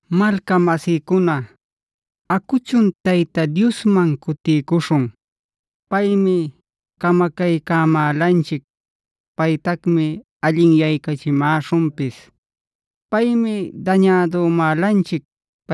Malcamasïcuna, acuchun Tayta Diosman cutiycuśhun. Paymi camacaycämälanchic; paytacmi allinyaycachimäśhunpis. Paymi dañädümälanchic;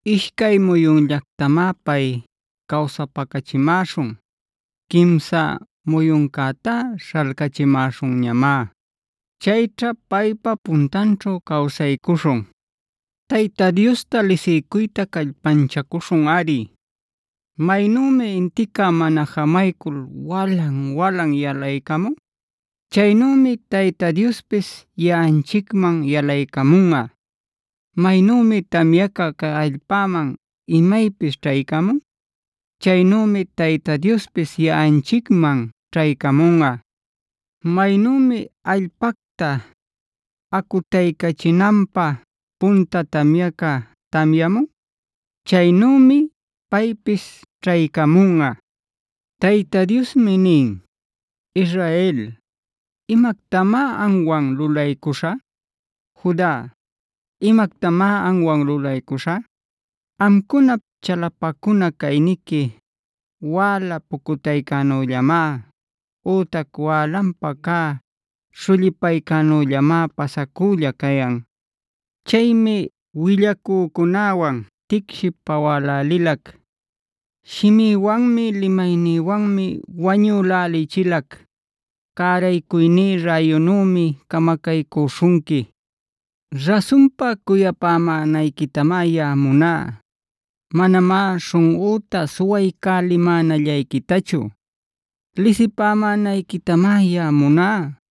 Ishcay muyunllactamá pay cawsapacächimäśhun. Quimsa muyuncätá śhalcächimäśhunñamá. Chayćha paypa puntanćhu cawsaycuśhun. Tayta Diosta lisiycuyta callpanchacuśhunꞌari. Maynümi intica mana jamaycul walan-walan yalaycamun, chaynümi Tayta Diospis yaꞌanchicman yalaycamunꞌa. Maynümi tamyaca cay allpäman imaypis ćhaycamun, chaynümi Tayta Diospis yaꞌanchicman ćhaycamunꞌa. Maynümi allpacta acutaycachinanpä punta tamyaca tamyamun, chaynümi paypis ćhaycamunꞌa. Tayta Diosmi nin: “Israel, ¿imactamá amwan lulaycuśhä? Juda, ¿imactamá amwan lulaycuśhä? Amcunap chalapacuna cayniqui wäla pucutaycänüllamá, ütac wälanpa cä śhullipaycänüllamá pasacülla cayan. Chaymi willacücunäwan ticshiy pawälälilac; shimïwanmi, limaynïwanmi wañülälichilac. Cäraycuyní räyunümi camacaycüśhunqui. Rasunpa cuyamänayquitamá yaꞌa muná, manamá śhunꞌüta suwaycalimänallayquitachu.b Lisipämänayquitamá yaꞌa muná,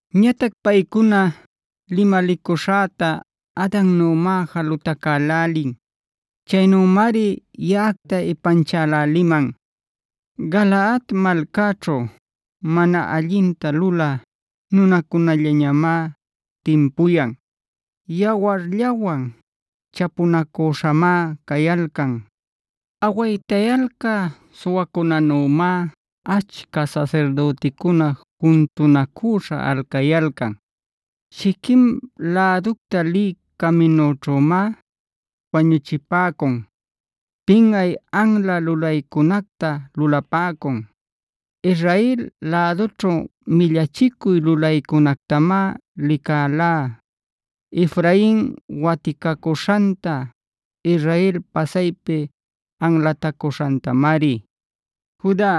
Ñatac paycuna limalicuśhäta Adannümá jalutacälälin. Chaynümari yaꞌacta ipanchäläliman. “Galaadd malcaćhu, mana allinta lulä nunacunallamá timpuyan; yawarllawan chapunacüśhamá cayalcan. Awaytayalcä suwacunänümá achca sasirdüticuna juntunacüśha alcayalcan. Shiquem läducta lï caminućhümá wañuchipäcun, pinꞌay anla lulaycunacta lulapäcun. Israel lädućhu millachicuy lulaycunactamá licalá: Efrain waticacuśhanta, Israel pasaypi anlatacuśhantamari. Juda,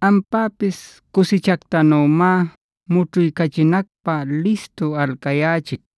ampäpis cusichactanümá mućhuycachinacpä listu alcayächic.